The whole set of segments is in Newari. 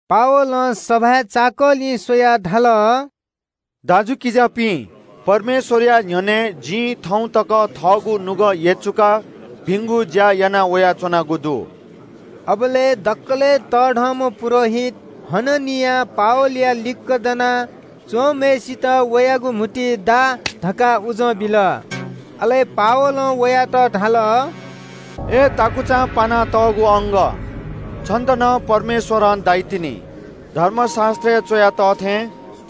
पावलं सभाय् चाकःछिं स्‍वयाः धाल – “दाजुकिजापिं, परमेश्‍वरया न्‍ह्यःने जिं थौं तक थःगु नुगः यचुकाः भिंगु ज्‍या याना वयाच्‍वनागु दु।” अबलय् दकलय् तःधंम्‍ह पुजाहारी हननियां पावलया लिक्‍क दना च्‍वंम्‍हय्‌सित वयागु म्‍हुतुइ दा धकाः उजं बिल। अले पावलं वयात धाल – “अय् सख्‍वालं पानातःगु अंगः, छन्‍त नं परमेश्‍वरं दाइतिनि। धर्मशास्‍त्रय् च्‍वया तः थें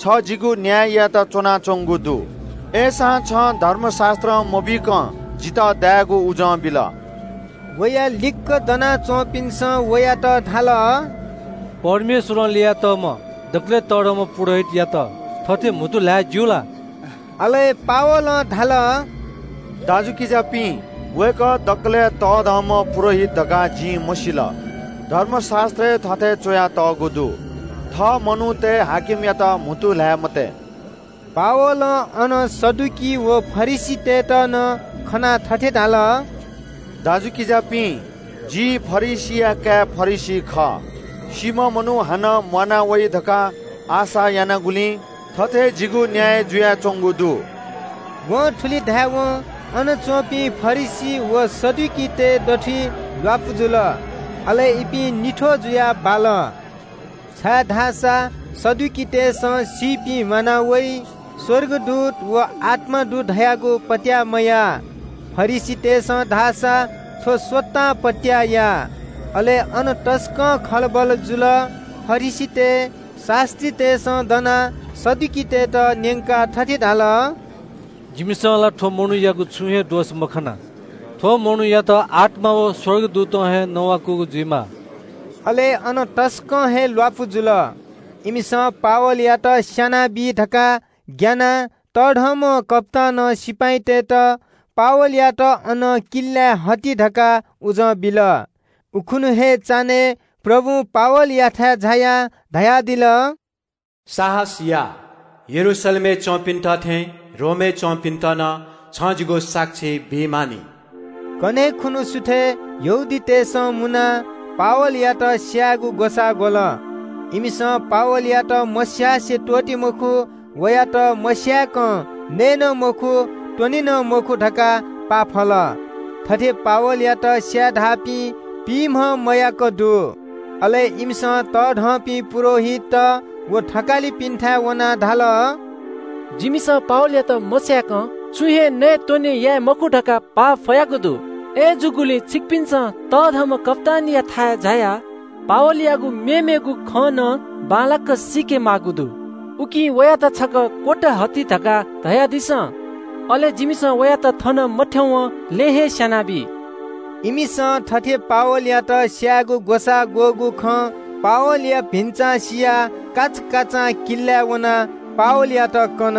छ जिगु न्‍याय यायेत च्‍वनाच्‍वंगु दु। अय्‌सां छं धर्मशास्‍त्रं मबीकं जितः दायेगु उजं बिल।” वया लिक्‍क दना च्‍वंपिन्‍सं वयात धाल – “परमेश्‍वरं ल्‍ययातःम्‍ह दकलय् तःधंम्‍ह पुजाहारीयात थथे म्‍हुतु ल्‍हाये ज्‍यू ला?” अले पावलं धाल – “दाजुकिजापिं, वय्‌कः दकलय् तःधंम्‍ह पुजाहारी धकाः जिं मसिल। धर्मशास्‍त्रय् थथे च्‍वयातःगु दु – ‘थः मनूतय् शासकयात म्‍हुतु ल्‍हाये मते।’” पावलं अन सदुकी व फरिसीतय्‌त नं खनाः थथे धाल – “दाजुकिजापिं, जि फरिसीया काय् फरिसी खः। सीम्‍ह मनू हानं म्‍वाना वइ धकाः आशा यानागुलिं थथे जिगु न्‍याय जुयाच्‍वंगु दु।” वं थुलि धायेवं अन च्‍वंपिं फरिसी व सदुकीतय् दथुइ ल्‍वापु जुल। अले इपिं निथ्‍वः जुयाः बाल, छाय्‌धाःसा सदुकीतय्‌सं सीपिं म्‍वाना वइ, स्‍वर्गदूत व आत्‍मा दु धयागु पत्‍याः मयाः। फरिसीतय्‌सं धाःसा थ्‍व स्‍वतां पत्‍याः याः। अले अन तसकं खलबल जुल। फरिसीतय् शास्‍त्रीतय्‌सं दनाः सदुकीतय्‌त न्‍यंकाः थथे धाल – “जिमिसं ला थ्‍व मनूयागु छुं हे दोष मखना। थ्‍व मनूयात आत्‍मां व स्‍वर्गदूतं हे नवाकूगु जुइमाः।” अले अन तसकं हे ल्‍वापु जुल। इमिसं पावलयात स्‍यानाबी धकाः ग्‍यानाः तःधंम्‍ह कप्‍तानं सिपाइँतय्‌त “पावलयात अनं किल्‍लाय् हजि” धकाः उजं बिल। उखुन्‍हु हे चान्‍हय् प्रभुं पावलयाथाय् झायाः धयादिल – “साहस या, यरूशलेमय् च्‍वंपिन्‍त थें रोमय् च्‍वंपिन्‍त नं छं जिगु साक्षी बी मानि।” कन्‍हय् खुन्‍हु सुथय् यहूदीतय् नायःतय्‌सं मुनाः पावलयात स्‍यायेगु ग्‍वसाः ग्‍वल। इमिसं “पावलयात मस्‍यासे त्‍वःते मखु, वयात मस्‍याय्‌कं नये नं मखु, त्‍वने नं मखु” धकाः पाफल। थथे पावलयात स्‍याये धाःपिं पिइम्‍हं मयाक दु। अले इमिसं तःधंपिं पुजाहारीत व थकालिपिन्‍थाय् वनाः धाल – “जिमिसं पावलयात मस्‍याय्‌कं छुं हे नयेत्‍वने याये मखु धकाः पाफयागु दु। अय्‌जूगुलिं छिकपिन्‍सं तःधंम्‍ह कप्‍तानयाथाय् झायाः ‘पावलयागु मेमेगु खँ नं बांलाक सीके माःगु दु, उकिं वयात छकः क्‍वत हजि’ धकाः धयादिसँ। अले जिमिसं वयात थन मथ्‍यंवं लँय् हे स्‍यानाबी।” इमिसं थथे पावलयात स्‍यायेगु ग्‍वसाः ग्‍वःगु खँ पावलया भिन्‍चां सियाः काचाकाचां किल्‍लाय् वनाः पावलयात कन।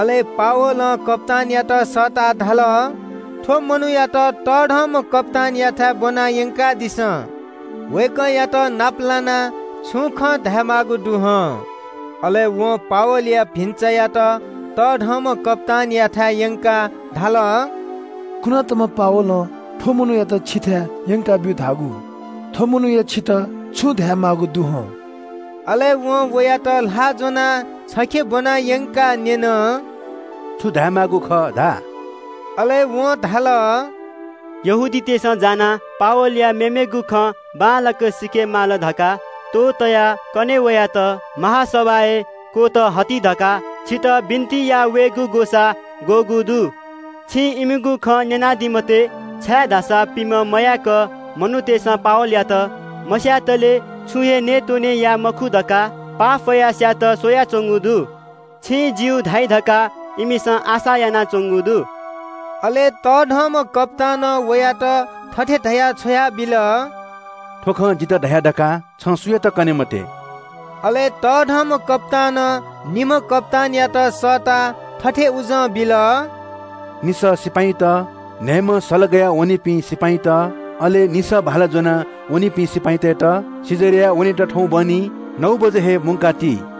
अले पावलं कप्‍तानयात सःताः धाल – “थ्‍व मनूयात तःधंम्‍ह कप्‍तानयाथाय् ब्‍वना यंकादिसँ। वय्‌कःयात नाप लानाः छुं खँ धायेमाःगु दु हं।” अले वं पावलया भिन्‍चायात तःधंम्‍ह कप्‍तानयाथाय् यंकाः धाल – “कुनातःम्‍ह पावलं थ्‍व मनूयात छिथाय् यंकाब्‍यु धाःगु। थ्‍व मनूया छितः छुं धायेमाःगु दु हं।” अले वं वयात ल्‍हाः ज्‍वनाः छखे ब्‍वना यंकाः न्‍यन – “छु धायेमाःगु खः धा?” अले वं धाल – “यहूदीतय् नायःतय्‌सं जानाः पावलया मेमेगु खँ बांलाक सीके माल धकाः त्‍वहः तयाः कन्‍हय् वयात महासभाय् क्‍वत हजि धकाः छितः बिन्‍ति याः वयेगु ग्‍वसाः ग्‍वःगु दु। छिं इमिगु खँ न्‍यनादी मते, छाय्‌धाःसा पिइम्‍हं मयाक मनूतय्‌सं पावलयात मस्‍यातले छुं हे नयेत्‍वने याये मखु धकाः पाफयाः स्‍यायेत स्‍वयाच्‍वंगु दु। छिं ‘ज्‍यू’ धाइ धकाः इमिसं आशा यानाच्‍वंगु दु।” अले तःधंम्‍ह कप्‍तानं वयात थथे धयाः छ्वयाबिल – “थ्‍व खँ जितः धया धकाः छं सुयातं कने मते।” अले तःधंम्‍ह कप्‍तानं निम्‍ह कप्‍तानयात सःताः थथे उजं बिल – “निसः सिपाइँत, न्‍हयेम्‍ह सल गया वनीपिं सिपाइँत, अले निसः भाला ज्‍वना वनीपिं सिपाइँतय्‌त कैसरियाय् वनेत थौं बहनी नौ बजे तक तयार याना ति।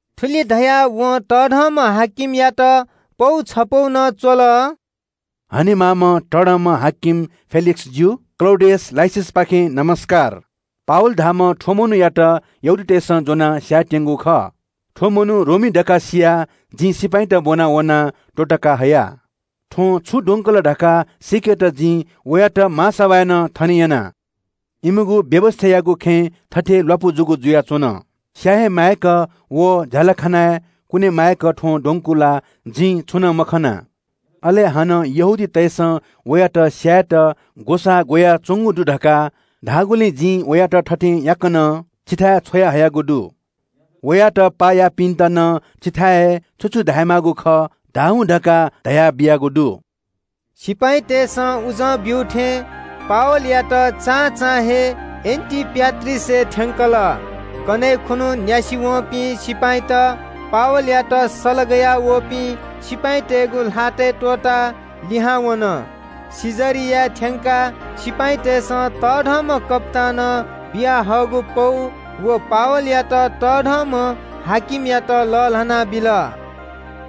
थुलि धयाः वं बडा-हाकिमयात पौ छपौ नं च्‍वल – “हनेमाःम्‍ह तःधंम्‍ह हाकिम फेलिक्‍सजु, क्‍लौडियस लुसियसपाखें ज्‍वजलपा। “पावल धाःम्‍ह थ्‍व मनूयात यहूदीतय्‌सं ज्‍वनाः स्‍यायेत्‍यंगु खः। थ्‍व मनू रोमी धकाः सियाः जिं सिपाइँत ब्‍वना वनाः त्‍वःतका हया। थ्‍वं छु द्वंकल धकाः सीकेत जिं वयात महासभाय् नं थने यना। इमिगु व्‍यवस्‍थायागु खँय् थथे ल्‍वापु जूगु जुयाच्‍वन। स्‍याये हे माय्‌क व झ्‍यालखानाय् कुने माय्‌क थ्‍वं द्वंकूगु ला जिं छुं नं मखना। अले हानं यहूदीतय्‌सं वयात स्‍यायेत ग्‍वसाः ग्‍वयाच्‍वंगु दु धकाः धाःगुलिं जिं वयात थथे याकनं छिथाय् छ्वयाहयागु दु। वयात पाः याःपिन्‍त नं छिथाय् हे छु छु धायेमाःगु खः धाः हुँ धकाः धयाबियागु दु।” सिपाइँतय्‌सं उजं ब्‍यू थें पावलयात चां चां हे एन्‍टिपाट्रिसय् थ्‍यंकल। कन्‍हय् खुन्‍हु न्‍यासि वंपिं सिपाइँत पावलयात सल गयावःपिं सिपाइँतय्‌गु ल्‍हातय् त्‍वःताः लिहां वन। कैसरियाय् थ्‍यंकाः सिपाइँतय्‌सं तःधंम्‍ह कप्‍तानं बियाहःगु पौ व पावलयात बडा-हाकिमयात लःल्‍हाना बिल।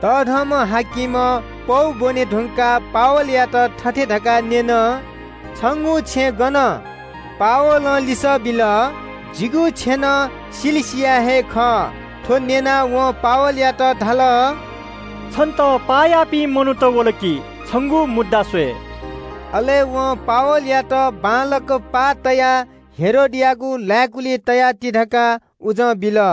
बडा-हाकिमं पौ ब्‍वने धुंकाः पावलयात थथे धकाः न्‍यन – “छंगु छेँ गन, छ गनं वयागु?” पावलं लिसः बिल – “जिगु छेँनं किलिकियाय् हे खः।” थ्‍व न्‍यनाः वं पावलयात धाल – “छन्‍त पाः याःपिं मनूत वल कि छंगु मुद्दा स्‍वये।” अले वं पावलयात बांलाक पाः तयाः हेरोदयागु लाय्‌कुलिइ तयाति धकाः उजं बिल।